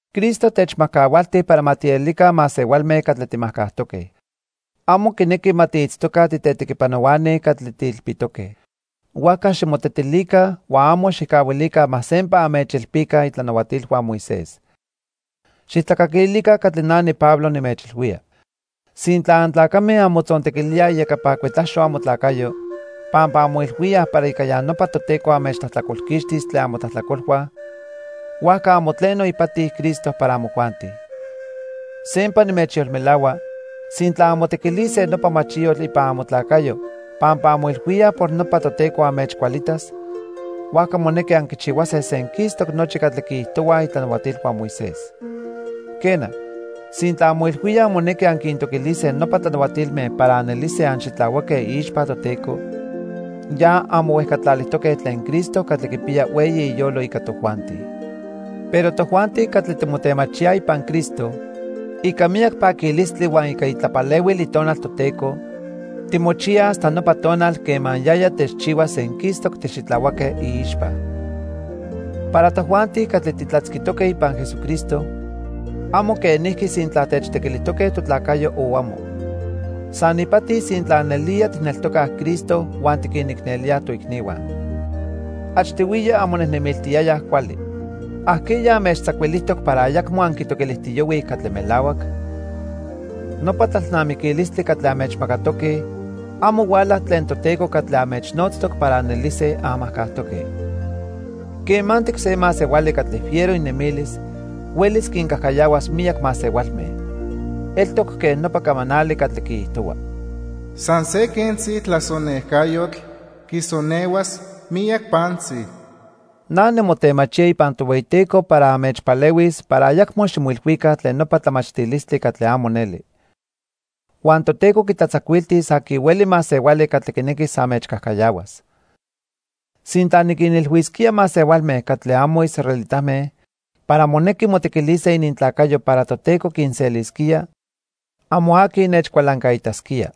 Cristo techmajcahualti para ma tielica masehualme catli timajcajtoque. Amo quinequi ma tiitztoca titetequipanohuani catli tiilpitoque. Huajca ximotetilica huan amo xijcahuilica ma sempa anmechilpica itlanahuatilhua Moisés. Xijtlacaquilica catli na niPablo nimechilhuía. Sintla antlacame anmotzontequilíaj iyecapa cuetlaxo amotlacayo pampa anmoilhuíaj para ica ya nopa Toteco anmechtlajtlacolquixtis tlen amotlajtlacolhua, huajca amo tleno ipati Cristo para amojuanti. Sempa nimechyolmelahua, sintla anmotequilise nopa machiyotl ipan amotlacayo pampa anmoilhuíaj por nopa Toteco anmechcualitas, huajca monequi anquichihuase senquistoc nochi catli quiijtohuaj itlanahuatilhua Moisés. Quena, sintla anmoilhuíaj monequi anquintoquilise nopa tlanahuatilme para anelise anxitlahuaque iixpa Toteco, ya anmohuejcatlalijtoque tlen Cristo catli quipiya hueyi iyolo ica tojuanti. Pero tojuanti catli timotemachíaj ipan Cristo, ica miyac paquilistli huan ica itlapalehuil Itonal Toteco timochiyaj hasta nopa tonal quema yaya techchihuas senquistoc tixitlahuaque iixpa. Para tojuanti catli titlatzquitoque ipan Jesucristo, amo quenijqui sintla techtequilijtoque totlacayo o amo. San ipati sintla nelía tijneltocaj Cristo huan tiquinicnelíaj toicnihua. Achtihuiya anmonejnemiltiyayaj cuali. ¿Ajqueya anmechtzacuilijtoc para ayacmo anquitoquilijtiyohuij catli melahuac? Nopa tlalnamiquilistli catli anmechmacatoque, amo huala tlen Toteco catli anmechnotztoc para anelise anmajcajtoque. Quemantic se masehuali catli fiero inemilis huelis quincajcayahuas miyac masehualme. Eltoc quen nopa camanali catli quiijtohua: "San se quentzi tlasonejcayotl quisonehuas miyac pantzi." Na nimotemachía ipan Tohueyiteco para anmechpalehuis para ayacmo ximoilhuica tlen nopa tlamachtilistli catli amo neli. Huan Toteco quitlatzacuiltis aqui hueli masehuali catli quinequis anmechcajcayahuas. Sintla niquinilhuisquía masehualme catli amo israelitame para monequi motequilise inintlacayo para Toteco quinselisquía, amo aqui nechcualancaitasquía.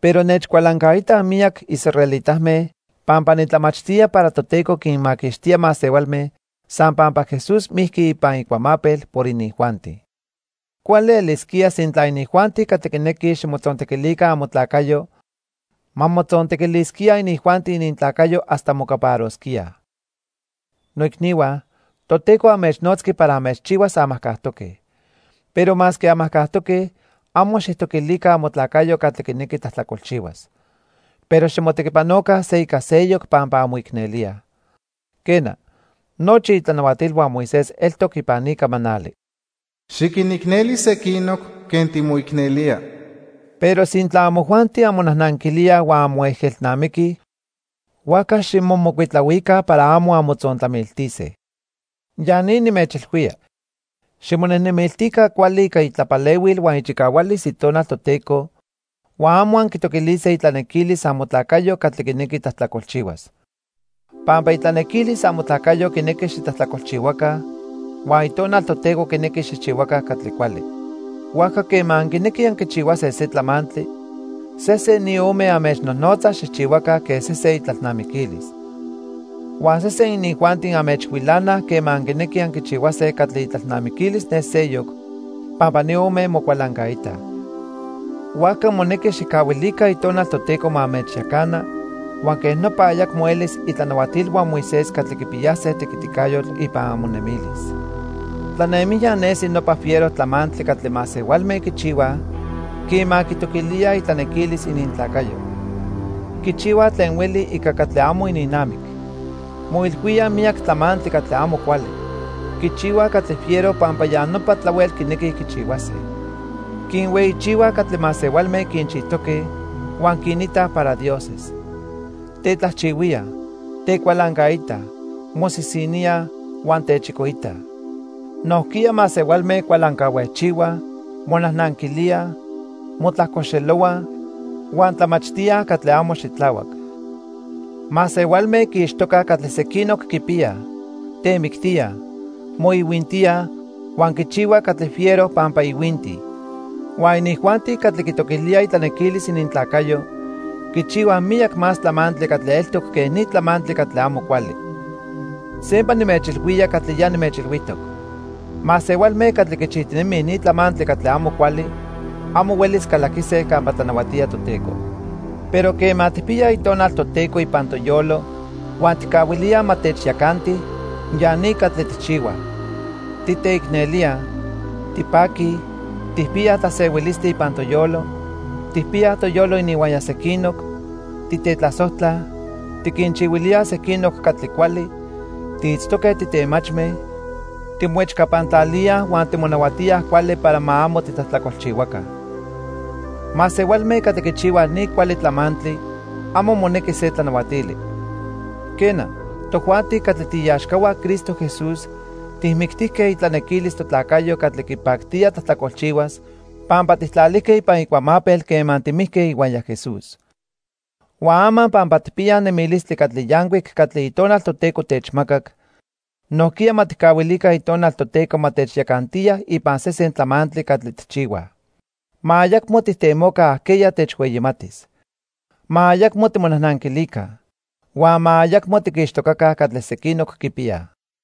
Pero nechcualancaitaj miyac israelitame pampa nitlamachtía para Toteco quinmaquixtía masehualme san pampa Jesús mijqui ipan icuamapel por inijuanti. Cuali elisquía sintla inijuanti catli quinequij ximotzontequilica amotlacayo, ma motzontequilisquíaj inijuanti inintlacayo hasta mocaparosquíaj. Noicnihua, Toteco anmechnotzqui para anmechchihuas anmajcajtoque. Pero masque anmajcajtoque, amo xijtoquilica amotlacayo catli quinequi tlajtlacolchihuas. Pero ximotequipanoca se ica seyoc pampa anmoicnelíaj. Quena, nochi itlanahuatilhua Moisés eltoc ipan ni camanali: "Xiquinicneli sequinoc quen timoicnelía." Pero sintla amojuanti anmonajnanquilíaj huan anmoejelnamiquij, huajca ximomocuitlahuica para amo anmotzontlamiltise. Ya ni nimechilhuía: Ximonejnemiltica cuali ica itlapalehuil huan ichicahualis Itonal Toteco huan amo anquitoquilise itlanequilis amotlacayo catli quinequi tlajtlacolchihuas. Pampa itlanequilis amotlacayo quinequi xitlajtlacolchihuaca, huan Itonal Toteco quinequi xijchihuaca catli cuali. Huajca quema anquinequij anquichihuase se tlamantli, sesen ni ome anmechnojnotza xijchihuaca quen sesen itlalnamiquilis. Huan sesen inijuanti anmechhuilanaj quema anquinequij anquichihuase catli itlalnamiquilis ne seyoc pampa ni ome mocualancaitaj. Huajca monequi xijcahuilica Itonal Toteco ma anmechyacana, huan quej nopa ayacmo elis itlanahuatilhua Moisés catli quipiyase tequiticayotl ipan amonemilis. Tlanemijya nesi nopa fiero tlamantli catli masehualme quichihuaj quema quitoquilíaj itlanequilis inintlacayo. Quichihuaj tlen hueli ica catli amo ininnamic. Moilhuíaj miyac tlamantli catli amo cuali. Quichihuaj catli fiero pampa ya nopa tlahuel quinequij quichihuase. Quinhueyichihuaj catli masehualme quinchijtoque huan quinitaj para dioses. Tetlajchihuíaj, tecualancaitaj, mosisiníaj, huan techicoitaj. Nojquiya masehualme cualancahuejchihuaj, monajnanquilíaj, motlajcoxelohuaj huan tlamachtíaj catli amo xitlahuac. Masehualme quiixtocaj catli sequinoc quipiyaj, temictíaj, moihuintíaj huan quichihuaj catli fiero pampa ihuintij. Huan inijuanti catli quitoquilíaj itlanequilis inintlacayo quichihuaj miyac más tlamantli catli eltoc quej ni tlamantli catli amo cuali. Sempa nimechilhuía catli ya nimechilhuijtoc. Masehualme catli quichijtinemij ni tlamantli catli amo cuali, amo huelis calaquise campa tlanahuatía Toteco. Pero quema tijpiyaj Itonal Toteco ipan toyolo huan tijcahuilíaj ma techyacanti, ya ni catli tijchihuaj: Titeicnelíaj, tipaquij, tijpiyaj tlasehuilistli ipan toyolo, tijpiyaj toyolo ininhuaya sequinoc, titetlasojtlaj, tiquinchihuilíaj sequinoc catli cuali, tiitztoque titemachme, timoechcapantlalíaj huan timonahuatíaj cuali para ma amo titlajtlacolchihuaca. Masehualme catli quichihuaj ni cuali tlamantli amo monequi se tlanahuatili. Quena, tojuanti catli tiiaxcahua Cristo Jesús tijmictijque itlanequilis totlacayo catli quipactía tlajtlacolchihuas pampa tijtlalijque ipan icuamapel quema timijque ihuaya Jesús. Huan ama pampa tijpiyaj nemilistli catli yancuic catli Itonal Toteco techmacac, nojquiya ma tijcahuilica Itonal Toteco ma techyacantiya ipan sesen tlamantli catli tijchihuaj. Ma ayacmo tijtemoca ajqueya techhueyimatis. Ma ayacmo timonajnanquilica. Huan ma ayacmo tiquixtocaca catli sequinoc quipiyaj.